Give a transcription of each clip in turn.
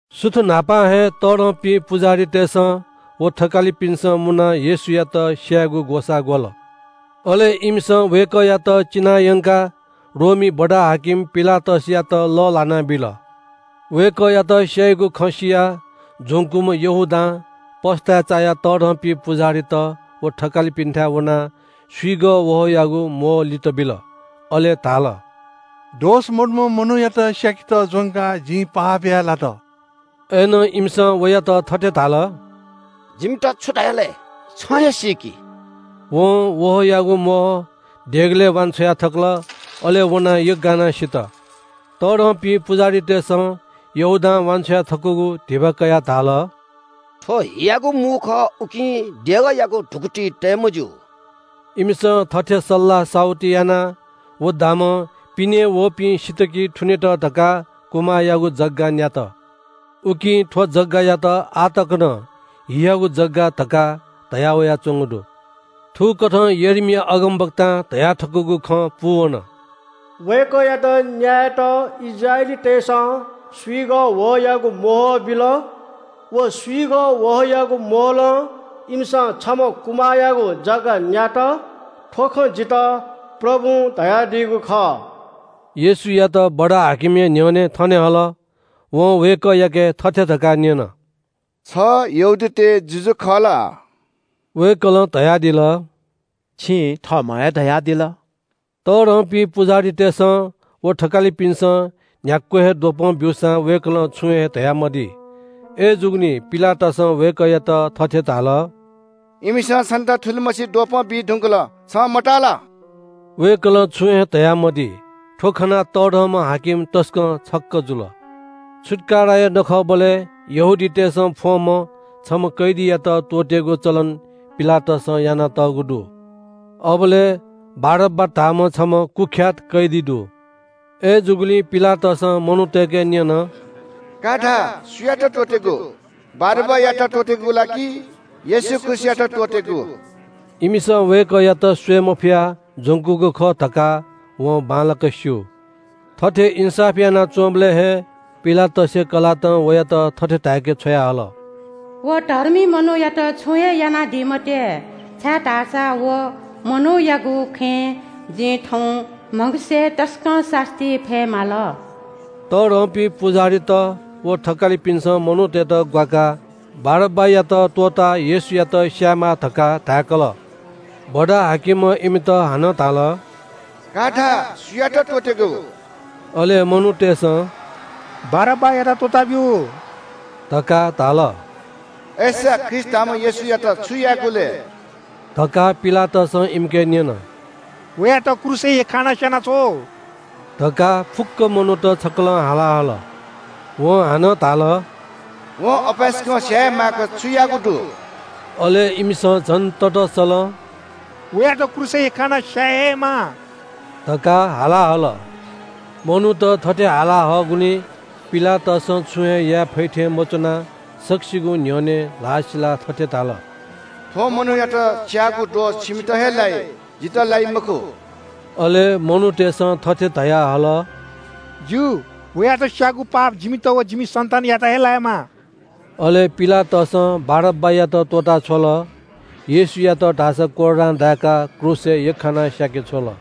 सुथ न्‍हापां हे तःधंपिं पुजाहारीतय्‌सं व थकालिपिन्‍सं मुनाः येशूयात स्‍यायेगु ग्‍वसाः ग्‍वल। अले इमिसं वय्‌कःयात चिनायंकाः रोमी बडा-हाकिम पिलातसयात लःल्‍हाना बिल। वय्‌कःयात स्‍याइगु खँ सियाः ज्‍वंकूम्‍ह यहूदां पस्‍ताय् चायाः तःधंपिं पुजाहारीत व थकालिपिन्‍थाय् वनाः स्‍विगः वहःयागु म्‍वहः लित बिल। अले धाल – “दोष मदुम्‍ह मनूयात स्‍याकेत ज्‍वंकाः जिं पाप याये लात।” अय्‌नं इमिसं वयात थथे धाल – “जिमित छु धया लय्? छं हे सीकि।” वं वहःयागु म्‍वहः देगलय् वान्‍छ्वया थकल। अले वनाः यग्‍गानाः सित। तःधंपिं पुजाहारीतय्‌सं यहूदां वान्‍छ्वया थकूगु धिबा कयाः धाल – “थ्‍व हियागु मू खः, उकिं देगःयागु धुकुतिइ तये मज्‍यू।” इमिसं थथे सल्‍लाह साहुति यानाः व दामं पिनें वःपिं सित कि थुनेत धकाः कुमाःयागु जग्‍गा न्‍यात। उकिं थ्‍व जग्‍गायात आः तक नं “हियागु जग्‍गा” धकाः धयावयाच्‍वंगु दु। थुकथं यर्मिया अगमवक्तां धयाथकूगु खँ पूवन – “वय्‌कःयात न्‍यायेत इस्राएलीतय्‌सं स्‍विगः वहःयागु म्‍वहः बिल। व स्‍विगः वहःयागु म्‍वहलं इमिसं छम्‍ह कुमाःयागु जग्‍गा न्‍यात। थ्‍व खँ जितः प्रभुं धयादीगु खः।” येशूयात बडा-हाकिमया न्‍ह्यःने थने हल। वं वय्‌कःयाके थथे धकाः न्‍यन – “छ यहूदीतय् जुजु खः ला?” वय्‌कलं धयादिल – “छिं थःम्‍हं हे धयादिल।” तःधंपिं पुजाहारीतय्‌सं व थकालिपिन्‍सं न्‍ह्याक्‍व हे द्वपं ब्‍यूसां वय्‌कलं छुं हे धयामदी। अय्‌जूगुलिं पिलातसं वय्‌कःयात थथे धाल – “इमिसं छन्‍त थुलिमछि द्वपं बी धुंकल छं मताः ला?” वय्‌कलं छुं हे धयामदी। थ्‍व खनाः तःधंम्‍ह हाकिम तसकं छक्‍क जुल। छुत्‍काराया नखःबलय् यहूदीतय्‌सं फ्‍वंम्‍ह छम्‍ह कैदीयात त्‍वःतेगु चलन पिलातसं यानातःगु दु। अबलय् बारब्‍बा धाःम्‍ह छम्‍ह कुख्‍यात कैदी दु। अय्‌जूगुलिं पिलातसं मनूतय्‌के न्‍यन – “का धा, सुयात त्‍वःतेगु? बारब्‍बायात त्‍वःतेगु ला कि येशू ख्रीष्‍टयात त्‍वःतेगु?” इमिसं वय्‌कःयात स्‍वये मफयाः ज्‍वंकूगु खः धकाः वं बांलाक स्‍यू। थथे इन्‍साफ यानाच्‍वंबलय् हे पिलातसया कलातं वयात थथे धाय्‌के छ्वयाहल – “व धर्मी मनूयात छुं हे यानादी मते, छाय्‌धाःसा व मनूयागु खँय् जिं थौं म्‍हगसय् तसकं सास्‍ती फये माल।” तःधंपिं पुजाहारीत व थकालिपिन्‍सं मनूतय्‌त ग्‍वाकाः बारब्‍बायात त्‍वःताः येशूयात स्‍यायेमाः धकाः धाय्‌कल। बडा-हाकिमं इमित हानं धाल – “का धा, सुयात त्‍वःतेगु?” अले मनूतय्‌सं “बारब्‍बायात त्‍वःताब्‍यु” धकाः धाल। “अय्‌सा ख्रीष्‍ट धाःम्‍ह येशूयात छु यायेगु लय्?” धकाः पिलातसं इमिके न्‍यन। “वयात क्रूसय् यख्‍खानाः स्‍यानाछ्व” धकाः फुक्‍क मनूत छकलं हाला हल। वं हानं धाल – “वं अपाय्‌सकं स्‍याये हे माय्‌क छु याःगु दु?” अले इमिसं झन ततःसलं – “वयात क्रूसय् यख्‍खानाः स्‍याये हे माः” धकाः हाला हल। मनूत थथे हाला हःगुलिं पिलातसं छुं हे याये फइ थें मच्‍वनाः सकसिगुं न्‍ह्यःने ल्‍हाः सिलाः थथे धाल – “थ्‍व मनूयात स्‍याःगु दोष छिमित हे लाइ, जितः लाइ मखु।” अले मनूतय्‌सं थथे धयाहल – “ज्‍यू, वयात स्‍याःगु पाप जिमित व जिमि सन्‍तानयात हे लायेमा।” अले पिलातसं बारब्‍बायात त्‍वःता छ्वल। येशूयात धाःसा कोर्रां दाय्‌काः क्रूसय् यख्‍खाना स्‍याके छ्वल।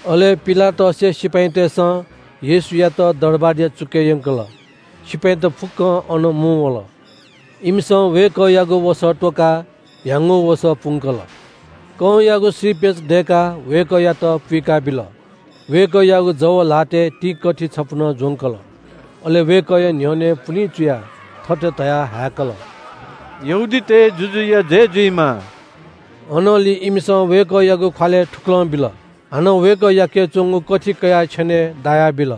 अले पिलातसया सिपाइँतय्‌सं येशूयात दरबारया चुकय् यंकल। सिपाइँत फुक्‍कं अन मुंवल। इमिसं वय्‌कःयागु वसः त्‍वकाः ह्याउँगु वसः पुंकल। कंयागु श्रीपेच दय्‌काः वय्‌कःयात पुइकाबिल। वय्‌कःयागु जव ल्‍हातय् तिंकथि छपु नं ज्‍वंकल। अले वय्‌कःया न्‍ह्यःने पुलिं चुयाः थथे धयाः हाय्‌कल – “यहूदीतय् जुजुया जय जुइमा।” अनंलि इमिसं वय्‌कःयागु ख्‍वालय् थुकलं बिल। हानं वय्‌कःयाके च्‍वंगु कथि कयाः छेनय् दाया बिल।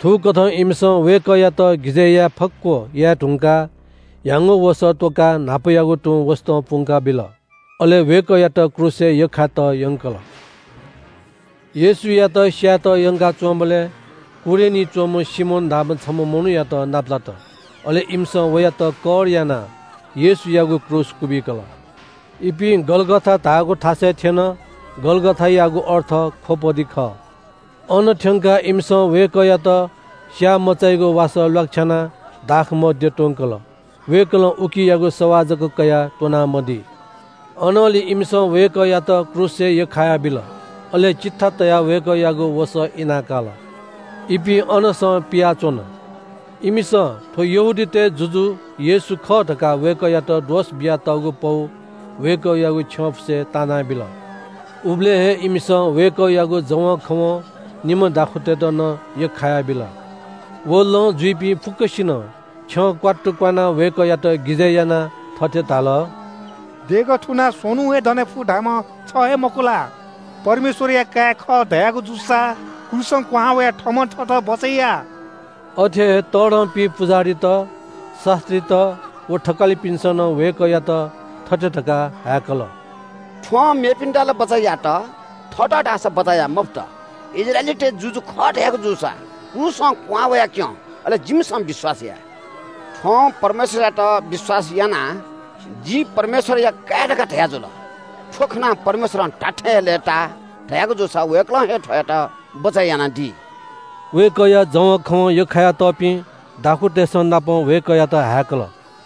थुकथं इमिसं वय्‌कःयात गिजय् याये फक्‍व याये धुंकाः ह्याउँगु वसः त्‍वकाः न्‍हापायागु तुं वसतं पुंका बिल। अले वय्‌कःयात क्रूसय् यख्‍खायेत यंकल। येशूयात स्‍यायेत यंकाच्‍वंबलय् कुरेनी च्‍वंम्‍ह सिमोन धाःम्‍ह छम्‍ह मनूयात नापलात। अले इमिसं वयात कर कर यानाः येशूयागु क्रूस क्‍वबिकल। इपिं गलगथा धाःगु थासय् थ्‍यन। गलगथायागु अर्थ खोपडी खः। अन थ्‍यंकाः इमिसं वय्‌कःयात स्‍याःमचाइगु वासः ल्‍वाकछ्यानाः दाखमद्य त्‍वंकल। वय्‌कलं उकियागु सवाः जक कयाः त्‍वना मदी। अनंलि इमिसं वय्‌कःयात क्रूसय् यख्‍खायाबिल। अले चिट्ठा तयाः वय्‌कःयागु वसः इना काल। इपिं अनसं पियाच्‍वन। इमिसं “थ्‍व यहूदीतय् जुजु येशू खः” धकाः वय्‌कःयात दोष बियातःगु पौ वय्‌कःयागु छ्यंफुसय् तिनाबिल। उबलय् हे इमिसं वय्‌कःयागु जवंखवं निम्‍ह दाखुँतय्‌त नं यख्‍खायाबिल। व लँ जुइपिं फुक्‍कसिनं छ्यं क्‍वात्तु क्‍वानाः वय्‌कःयात गिजय् यानाः थथे धाल – “देगः थुनाः स्‍वन्‍हुं हे दने फु धाःम्‍ह छ हे मखु ला? परमेश्‍वरया काय् खः धयागु जूसा क्रूसं क्‍वहां वयाः थःम्‍हं थःत बचय् या।” अथे हे तःधंपिं पुजाहारीत, शास्‍त्रीत व थकालिपिन्‍सं नं वय्‌कःयात थथे धकाः हाय्‌कल – “थ्‍वं मेपिन्‍त ला बचय् यात, थःत धाःसा बचय् याये मफुत। इस्राएलीतय् जुजु खः धयागु जूसा क्रूसं क्‍वहां वयाक्‍यँ। अले जिमिसं विश्‍वास याये। थ्‍वं परमेश्‍वरयात विश्‍वास यानाः – ‘जि परमेश्‍वरया काय् खः’ धयाजुल। थ्‍व खनाः परमेश्‍वर धात्‍थें हे लय्‌ताः धयागु जूसा वय्‌कलं हे थ्‍वयात बचय् यानादी।” वय्‌कःया जवंखवं यख्‍खाया तःपिं दाखुँतय्‌संनापं वय्‌कःयात हाय्‌कल।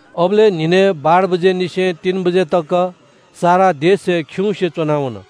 अबलय् न्‍हिनय् बाह्र बजेनिसें तीन बजे तक सारा देश हे खिउँसे च्‍वना वन।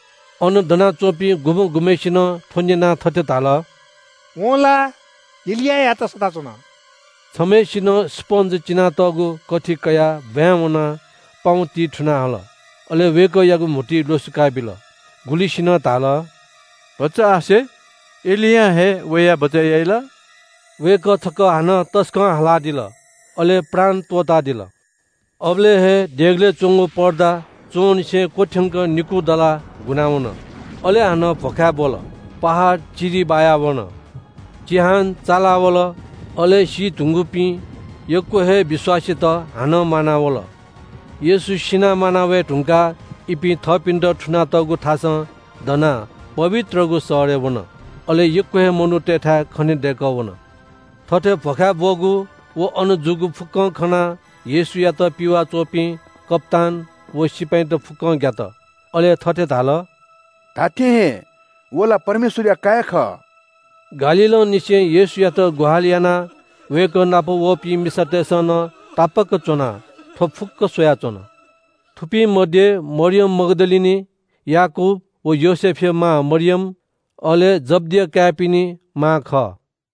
अन दनाच्‍वंपिं गुम्‍ह गुम्‍हय्‌सिनं थ्‍व न्‍यनाः थथे धाल – “वं ला एलियायात सःता च्‍वन।” छम्‍हय्‌सिनं स्‍पन्‍ज चिनातःगु कथि कयाः ब्‍वाँय् वनाः पाउँतिइ थुनाः हल, अले वय्‌कःयागु म्‍हुतुइ ल्‍वसुकाबिल। गुलिसिनं धाल – “भचा आसे, एलियां हे वयाः बचय् याइ ला?” वय्‌कः छकः हानं तसकं हालादिल, अले प्राण त्‍वःतादिल। अबलय् हे देगलय् च्‍वंगु पर्दा च्‍वंनिसें क्‍वथ्‍यंक निकू दलाः गुना वन। अले हानं भ्‍वखाय् ब्‍वल। पहाड चिरि बायावन। चिहान चाला वल। अले सी धुंकूपिं यक्‍व हे विश्‍वासीत हानं म्‍वानावल। येशू सिनाः म्‍वाना वये धुंकाः इपिं थःपिन्‍त थुनातःगु थासं दनाः पवित्रगु शहरय् वन। अले यक्‍व हे मनूतय्‌थाय् खनेदय्‌कः वन। थथे भ्‍वखाय् ब्‍वःगु व अन जूगु फुक्‍कं खनाः येशूयात पिवाः च्‍वंपिं कप्‍तान व सिपाइँत फुक्‍कं ग्‍यात। अले थथे धाल – “धात्‍थें हे व ला परमेश्‍वरया काय् खः।” गालीलंनिसें येशूयात ग्‍वाहालि यानाः वय्‌कः नाप वःपिं मिसातय्‌सं नं तापाक्‍क च्‍वनाः थ्‍व फुक्‍क स्‍वयाच्‍वन। थुपिं मध्‍ये मरियम मग्‍दलिनी, याकूब व योसेफया मां मरियम, अले जब्‍दिया काय्‌पिनि मां खः।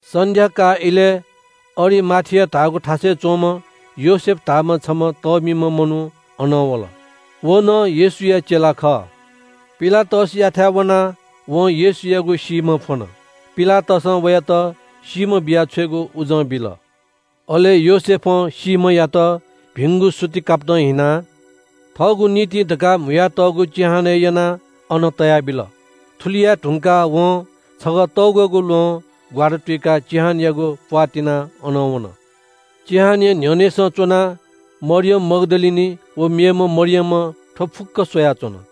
सन्‍ध्‍याकाः इलय् अरिमाथिया धाःगु थासय् च्‍वंम्‍ह योसेफ धाःम्‍ह छम्‍ह तःमिम्‍ह मनू अन वल। व नं येशूया चेला खः। पिलातसयाथाय् वनाः वं येशूयागु सीम्‍ह फ्‍वन। पिलातसं वयात सीम्‍ह बिया छ्वयेगु उजं बिल। अले योसेफं सीम्‍हयात भिंगु सुति कापतं हिनाः थःगु निंतिं धकाः म्‍हुयातःगु चिहानय् यनाः अन तयाबिल। थुलि याये धुंकाः वं छगः तग्‍वःगु ल्‍वहं ग्‍वारातुइकाः चिहानयागु प्‍वाः तिनाः अनं वन। चिहानया न्‍ह्यःनेसं च्‍वनाः मरियम मग्‍दलिनी व मेम्‍ह मरियमं थ्‍व फुक्‍क स्‍वयाच्‍वन।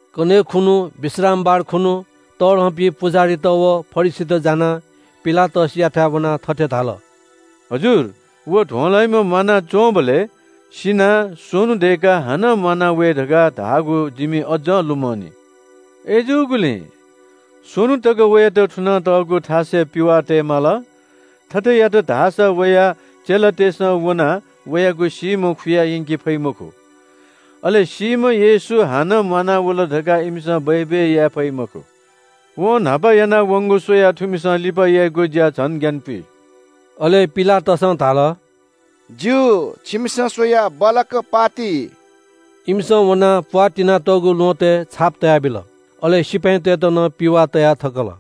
कन्‍हय् खुन्‍हु, विश्रामबार खुन्‍हु तःधंपिं पुजाहारीत व फरिसीत जानाः पिलातसयाथाय् वनाः थथे धाल – “हजुर, व ध्‍वंलाइम्‍हं म्‍वानाच्‍वंबलय् – ‘सिनाः स्‍वन्‍हु दय्‌काः हानं म्‍वाना वये’ धकाः धाःगु जिमि अज्‍ज लुमंनि। अय्‌जूगुलिं स्‍वन्‍हु तक वयात थुनातःगु थासय् पिवाः तये माल। थथे यात धाःसा वया चेलातय्‌सं वनाः वयागु सीम्‍ह खुयायंके फइ मखु। अले सीम्‍ह येशू हानं म्‍वानावल धकाः इमिसं बय्‌बय् याये फइ मखु। वं न्‍हापा याना वंगु स्‍वयाः थुमिसं लिपा याइगु ज्‍या झन ग्‍यानपुइ।” अले पिलातसं धाल – “ज्‍यू, छिमिसं स्‍वयाः बल्‍लाक पाः ति।” इमिसं वनाः प्‍वाः तिनातःगु ल्‍वहँतय् छाप तयाबिल। अले सिपाइँतय्‌त नं पिवाः तया थकल।